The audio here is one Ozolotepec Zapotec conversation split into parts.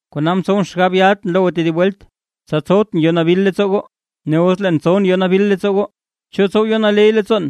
Kona mtsowʼn xgab yatʼn lo goo tedib welt, tsa tsowtʼn yo nabil leettsoo goo. Ne os leen tsowʼn yo nabil leettsoo goo, ¿cho tsow yo naley leettsoon,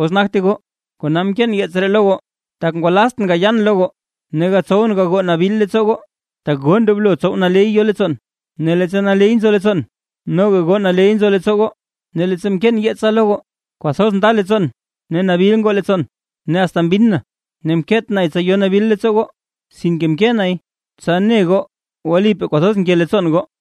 os nagte goo? Kona mkeen yeets ree lo goo, tak ngwalaztʼn gayan lo goo, ne gatsowʼn gagoo nabil leettsoo goo, tak goo ndoblo tsow naley yo leettsoon. Ne leettsa naley nzo leettsoon, noga goo naley nzo leettsoo goo. Ne leettsa mkeen yeetsa lo goo, kwathoz nda leettsoon ne nabil ngoo leettsoon, ne asta mbinn na. Ne mkeet nay tsa yo nabil leettsoo goo, sinke mkee nay tsa ne goo wlipaa kwathoz nke leettsoon goo.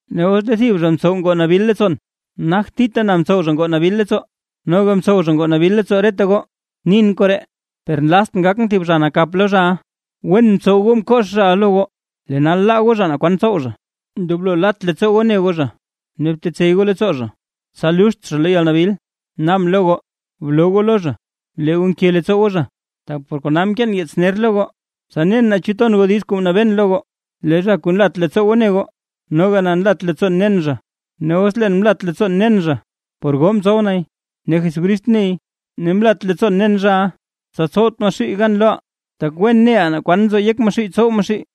Ne os lee thib zha mtsow ngoo nabil leettsoon, nagt thita na mtsow zha ngoo nabil leettsoo, noga mtsow zha ngoo nabil leettsoo reta goo. Nin koree, per nlaztʼn gakʼn thib zha nakap lo zhaʼa. Wen mtsow goo mkox zhaʼa lo goo, lee nal laa goo zha naa kwan tsow zha. Ndoblo lat leettsoo goo ne goo zha, ne btetsey goo leettsoo zha, tsa luxt zha lo yalnabil. Naabʼn lo goo, bloo goo lo zha lee goo nke leettsoo goo zha. Tak par kona mkeen yeets ner lo goo, tsa nen naa chu ton goo diiz kuu mnabeen lo goo. Lee zha kuu nlat leettsoo goo ne goo, noga na nlat leettsoon nen zha. Ne os leen mlat leettsoon nen zha, por goo mtsow nay, ne Jesucrist ney. Ne mlat leettsoon nen zhaʼa, tsa tsowt Maxuuy gan loʼaa; tak wen neʼaa naa kwan nzo yek Maxuuy tsow Maxuuy.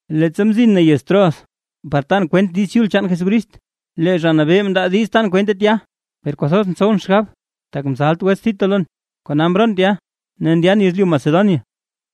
Leettsa mzin na yez Troas, par tan kwent Diiz Chul chaan Jesucrist, lee Zha Nabee mndaa diiz tan kwente tya. Per kwathoz ntsowʼn xgab, tak mzalt wets Tito lon; kona mroon tya ne ndyan yezlyu Macedonia.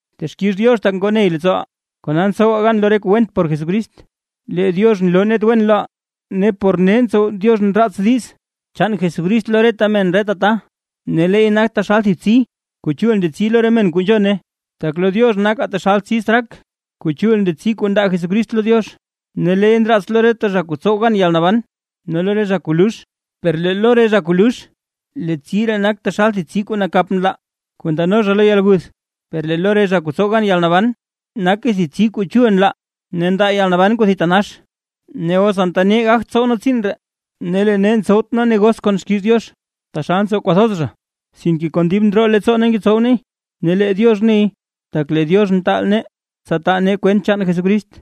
Texkix Diox tak ngoo ney Diox leettsooʼaa, kona ntsowaa gan lo re kuu went por Jesucrist. Lee Diox nloo net wen loʼaa ne por nee ntsow Diox nraats diiz chaan Jesucrist lo re men reta ta; ne leey nak taxal thib tsi kuu chul ndetsi lo re men kuu nzhone. Tak lo Diox nakaa taxal tsi straak, kuu chul ndetsi kuu ndaa Jesucrist lo Diox, ne leey ndraats lo re zha kuu tsow gan yalnaban ne lo re zha kuu lux. Per lee lo re zha kuu lux, lee tsi ree nak taxal tsi kuu nakap nlaa kuu ndano zha lo yalguth; per lee lo re zha kuu tsow gan yalnaban, nake thib tsi kuu chul ndetsi, ne ndaa yalnaban kuu thitanax. Ne os anta nee gagt tsow nee tsiin ree. Ne lee nee ntsowt nee negos kon xkiiz Diox, taxal ntsow kwathoz zha; sinke kon dib ndroo leettsoo nee ngetsow neey ne lee Diox neey, tak lee Diox mtaal nee, tsa taa nee kwent chaan Jesucrist.